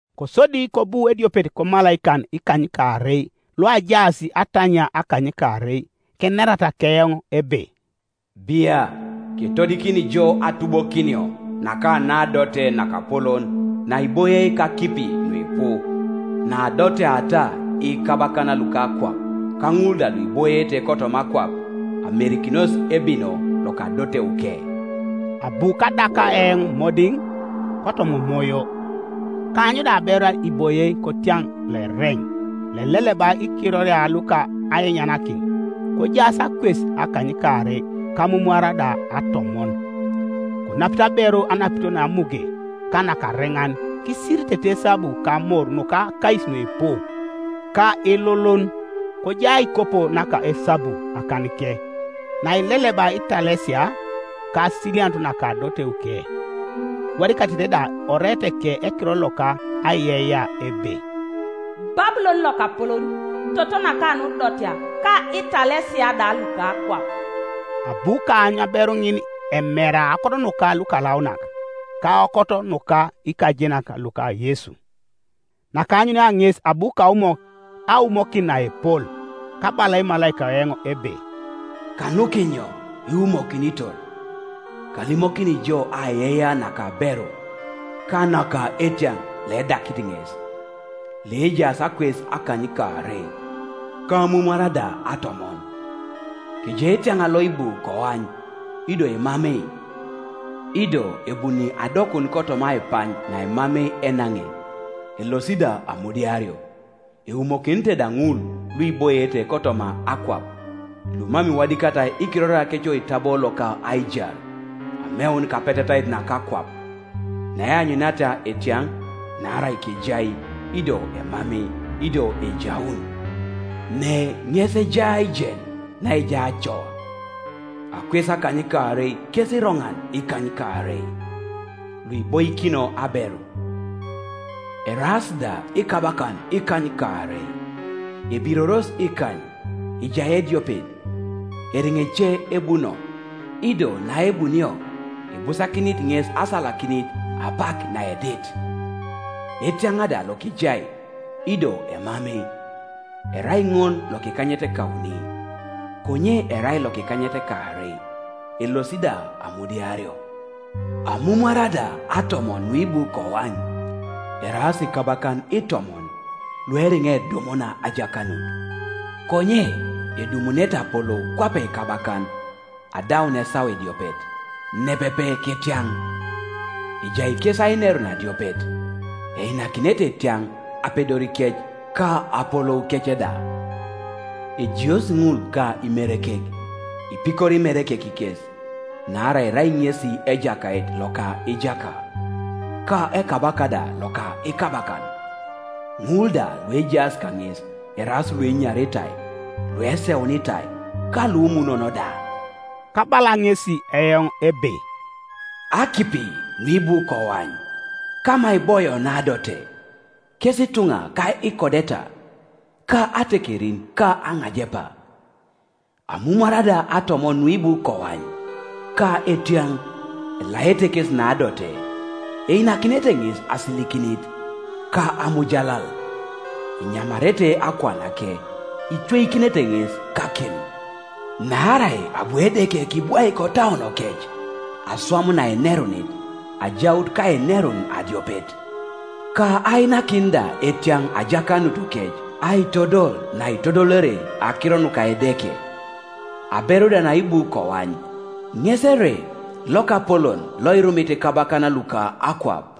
Kosodi kobu ediopet komalaikan ikanykaarei luajaas atanyia akanykaarei, kenerata keoŋ ebe, “Bia, ketodikini jo atubokinio naka naadote nakapolon naiboie kakipi nuipu, naadoteata ikabakan luka akwap, ka ŋul da luiboiete kotoma akwap amerikinos ebino loka adoteuke.” Abu kadaka eoŋ modiŋ kotoma Omoyo; kaany da aberu iboie kotiaŋ loereŋ, loileleba ikiroria luka ainyanakin, kojaas akwes akanykaarei ka amumwara da atomon. Konapit aberu anapito namuge ka nakareŋan kisiritete esabu ka amor nuka akais nuipu, ka ilulun, kojai aikopo naka esabu akanike, naileleba italesia, ka asilianut naka adoteuke; iwadikatete da oreeteke ekiror loka aiyeiyea ebe: “Babulon lokapolon, toto naka nudotea, ka italesia da luka akwap.” Abu kaany aberu ŋin emera aokot nuka lukalaunak ka aokot nuka ikajenak luka Yesu. Nakaanyunia ŋes abu kaumok aumokin naepol. Kabala emalaika eoŋ ebe, “Kanukinyo iwumokinitor? Kalimokini jo aiyeiyea naka aberu, ka naka etiaŋ loedakit ŋes, loejaas akwes akanykaarei, ka amumwara da atomon. Kejai etiaŋ loibu koany, ido emamei, ido ebuni adokun kotoma aipany naemamei enaŋe, elosi da amudiario; eumokinete da ŋul luiboiete kotoma akwap, lumam iwadikatai ikiroriakec oitabo loka aijar ameun kapetetait naka akwap, naeanyuniata etiaŋ, naarai kejai, ido emamei, ido ejaun. Ne ŋes ejai aijen naejai acoa: akwes akanykaarei kes iroŋan ikanykaarei, luiboikino aberu; eraas da ikabakan ikanykaarei, ebiroros ikany, ejai ediopet, eriŋa ece ebuno, ido naebunio ibusakinit ŋes asalakinit apak naedit. Etiaŋ da lokejai, ido emamei, erai ŋol lokikanyetekauni, konye erai lokokanykaarei, elosi da amudiario. Amumwara da atomon nuibu koany eraas ikabakan itomon lueriŋa edumuna ajakanut, konye edumunete apolou kwape ikabakan adaun esawa ediopet, nepepe ketiaŋ, Ejai kes ainerun adiopet, einakinete etiaŋ apedorikec ka apoloukec da. Ejiosi ŋul ka Imerekek, ipikori Imerekek kes, naarai erai ŋesi Ejakait loka ijaka, ka Ekabaka da loka ikabakan, ŋul da luejaas kaŋes eraas luenyaritai, lueseunitai, ka lumunon da.” Kabala ŋesi eoŋ ebe, “Akipi nuibu koany, kama iboio naadote, kes ituŋa ka ikodeta, ka atekerin ka aŋajepa. Amumwara da atomon nuibu koany, ka etiaŋ, elaete kesi naadote; einakinete ŋes asilikinit, ka amujalal, enyamarete akuanake, icweikinete ŋes kakim, naarai abu Edeke kibwaik otauonokec aswam naenerunit, ajaut kainerun adiopet, ka ainakin da etiaŋ ajakanutukec, aitodol naitodolere akiro nuka Edeke. Aberu da naibu koany ŋes ere lokapolon loirumit ikabakan luka akwap.”